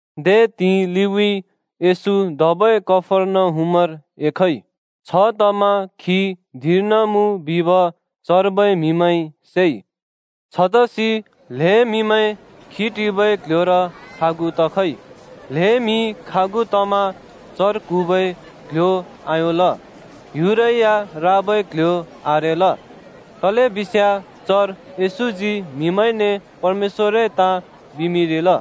दे त्हिंइ लिउँइँ येशू धबै कफर्नहुमर एखइ। छतमा खी धिंर्न मुँ बिब चर्बै म्हिमैंइ सेइ। छतसि ल्‍हें म्‍हिमैं खी टिबै क्ल्ह्‍योर खागु तखइ। ल्हें म्हि खागु तमा चर क्हुँबै क्‍ल्‍ह्‍यो आयोंल, ह्‍युरै या राबै क्‍ल्‍ह्‍यो आरेल। तलेबिस्याँ चर येशूजी म्हिमैंने परमेश्‍वरए ताँ बिमिंरिल।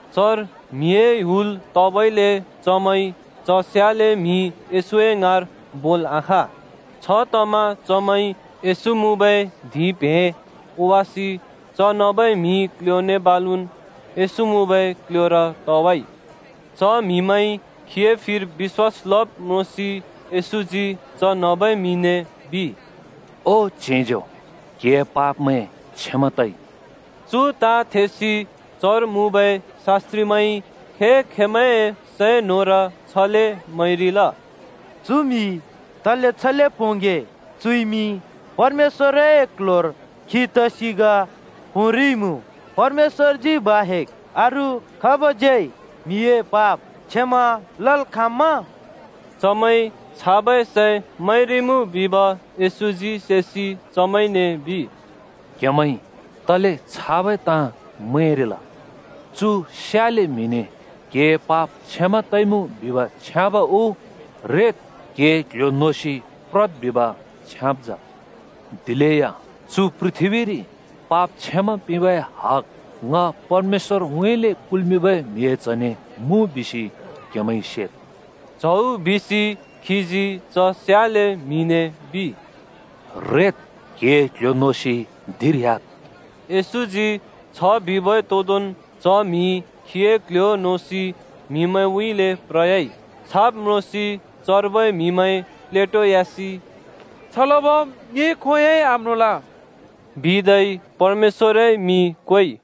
चर म्‍हिए हुल तबइले चमैंइ च स्याले म्हि येशूए ङाँर बोल् आखाँ। छतमा चमैंइ येशू मुँबै धिंप्हें ओवासि च नबै म्‍हि क्‍ल्‍ह्‍योने बालुन् येशू मुँबै क्‍ल्‍ह्‍योर तवाइ। च म्‍हिमैंइ खीए फिर बिश्‍वास लब् म्रोंसि येशूजी च नबै म्‍हिने बिइ, “ओ च्हेंज्यो, क्‍हिए पापमैं क्षमा तइ।” चु ताँ थेसि चर मुँबै शास्‍त्रिमैंइ खे-खेंमैंए सैं न्‍होंर छले मैंरिल, “चु म्हि तले छले पोंगे? चुइमि परमेश्‍वरए क्ल्ह्‍योर खी तसि ग पोंरिइमुँ! परमेश्‍वरजी बाहेक् अरू खाबज्यै म्हिए पाप क्षमा लल् खाँम्‍मा?” चमैंइ छाबै सैं मैंरिमुँ बिब येशूजी सेसि चमैंने बिइ, “क्‍हेमैंइ तले छाबै ताँ मैंरिल? चु स्याले म्‍हिने क्हिए पाप क्षमा तइमुँ बिब छ्याँब उ ‘रेद्, क्‍हिए क्ल्ह्‍यो नोसि प्रद्’ बिब छ्याँब जा? दिलेया चु पृथ्‍बीरि पाप क्षमा पिंबै हग ङ परमेश्‍वरउँइँले कुल्‍मिंबै म्हिए च्हने मुँ बिसि क्हेमैंइ सेद्।” च्हौ बिसि खीजी च स्याले म्हिने बिइ, “रेद्, क्‍हिए क्‍ल्‍ह्‍यो नोसि धिंर ह्‍याद्।” येशूजी छ बिबै तोदोंन् च म्‍हि खीए क्ल्ह्‍यो नोसि म्हिमैंउँइँले प्रयाइ। छाब् म्रोंसि चर्बै म्‍हिमैं प्लेटोयासि “छ लबम् ङिइ खोंयोंइ आम्रोंल।” बिदै परमेश्‍वरए मिं क्वेइ।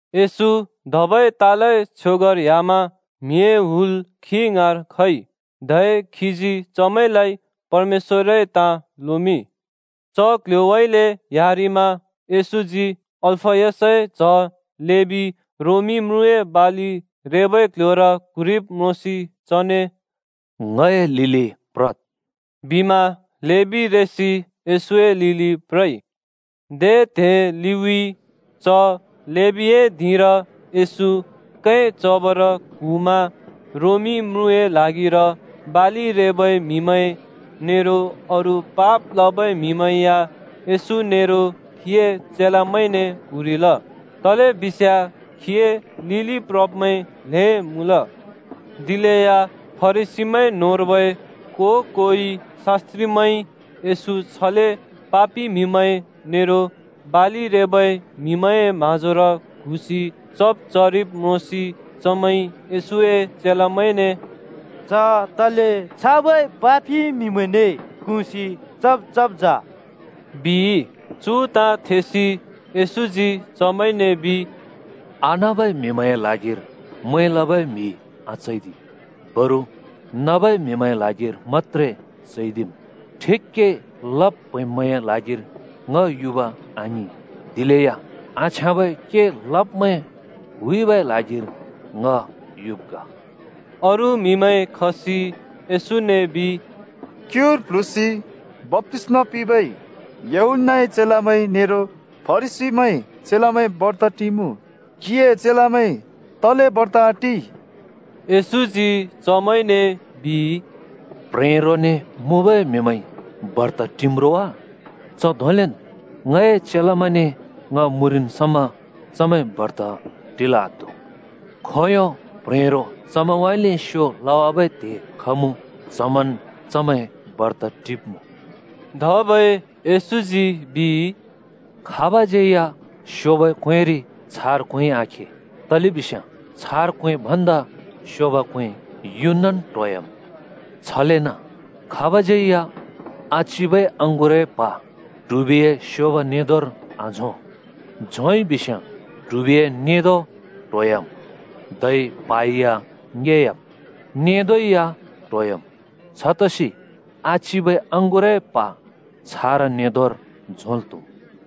येशू धबै तालए छ्योगर ह्‍यामा म्हिए हुल खी ङाँर खइ। धै खीजी चमैंलाइ परमेश्‍वरए ताँ लोमिंइ। च कल्ह्‍योउँइँले ह्‍यारिमा येशूजी अल्‍फयसए च्‍ह लेबी रोमी म्रुँए बालि रेबै क्ल्ह्‍योर क्हुँरिब् म्रोंसि चने, “ङए लिलि प्रद्,” बिमा लेबी रेसि येशूए लिलि प्रइ। दे त्हे लिउँइँ च लेबीए धिंर येशू कैं चबर क्हुँमा रोमी म्रुँए ल्हागिर बालि रेबै म्‍हिमैं नेरो अरू पाप लबै म्हिमैं या येशू नेरो खीए चेलामैंने क्हुँरिल। तलेबिस्याँ खीए लिलि प्रब्मैं ल्हें मुँल। दिलेया फरिसीमैं न्होंर्बै को-कोइ शास्‍त्रिमैंइ येशू छले पापि म्‍हिमैं नेरो बालि रेबै म्‍हिमैंए म्‍हाँजोर क्हुँसि चब् चरिब् म्रोंसि चमैंइ येशूए चेलामैंने “च तले छाबै पापि म्‍हिमैंने क्हुँसि चब् चब्जा?” बिइ। चु ताँ थेसि येशूजी चमैंने बिइ, “आनबै म्‍हिमैंए ल्हागिर मैं लबै म्‍हि आचैदि, बरु नबै म्‍हिमैंए ल्हागिर मत्‍त्रे चैदिम्। ठिक के लब् प्हैंब्मैंए ल्हागिर ङ युब आङिं, दिलेया आछ्याँबै के लब्मैं हुइबै ल्हागिर ङ युब् ग।” अरू म्हिमैं खसि येशूने बिइ, “क्‍युर प्ल्हुँसि बप्‍तिस्‍मा पिंबै यूहन्‍नाए चेलामैं नेरो फरिसीमैंए चेलामैं बर्त टिमुँ। क्हिए चेलामैं तले बर्त आटि?” येशूजी चमैंने बिइ, “प्ह्रेरोने (दुलहाने) मुँबै म्हिमैंइ बर्त टिम्‌ रोवा? च धोंलेन् ङए चेलामैंने ङ मुँरिन् समा चमैं बर्त टिल् आत्हु! खोंयों प्ह्रेरो चमैंउँइँले स्यो लवाबै त्हे खमुँ च्हमन् चमैं बर्त टिब्‍मुँ।” धबै येशूजी बिइ, “खाबज्‍यै या स्योंबै क्‍वेंरि छारा क्‍वेंइ आखे तलेबिस्याँ छारा क्वें भन्दा स्योब क्वें युनन् ट्होह्‍याम्। छलेन खाबज्‍यै या आचिबै अँगुरए प्हा ट्हुबिए स्योब नेंदोंर आझों। झोंइ बिस्‍याँ ट्हुबिए नेंदों ट्होवाम् धै प्हा या ङेयाम्, नेंदों या ट्होयाम्। छतसि आचिबै अँगुरए प्हा छारा नेंदोंर झोंल् त्हुम्।”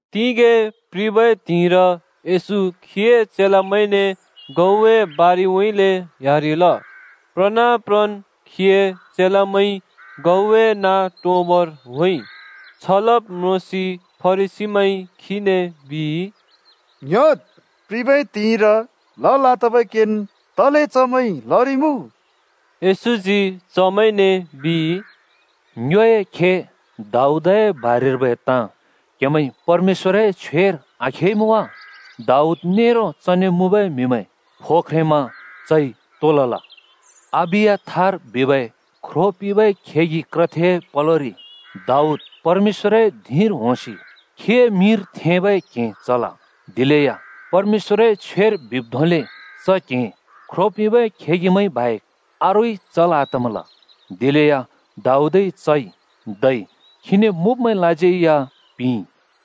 तिगें प्रिबै त्हिंइर येशू खीए चेलामैंने गहुँए बारिउँइँले ह्‍यारिल। प्रना प्रन् खीए चेलामैंइ गहुँए नाँ टोंबर होंइ। छ लब् म्रोंसि फरिसीमैंइ खीने बिइ, “ङ्‌ह्‍योद्, प्रिबै त्हिंइर लल् आतबै केन् तले चमैंइ लरिइमुँ?” येशूजी चमैंने बिइ, “ङ्योए खे दाऊदए बारेर्बै ताँ क्‍हेमैंइ परमेश्‍वरए छ्वेर आखेइमुँ वा? दाऊद नेरो चने मुँबै म्‍हिमैं फो ख्रेंमा चइ तो लल? अबियाथार बिबै ख्रो पिंबै खेगि क्रथेए पलोरि दाऊद परमेश्‍वरए धिंर होंसि खीए मिंर थेंबै क्हें चल। दिलेया परमेश्‍वरए छ्वेर बिब् धोंले च क्‍हें ख्रो पिंबै खेगिमैंइ बाहेक अरूइ चल् आतमल। दिलेया दाऊदइ चइ, धै खीने मुँब्‍मैंलाज्यै या पिंइ।”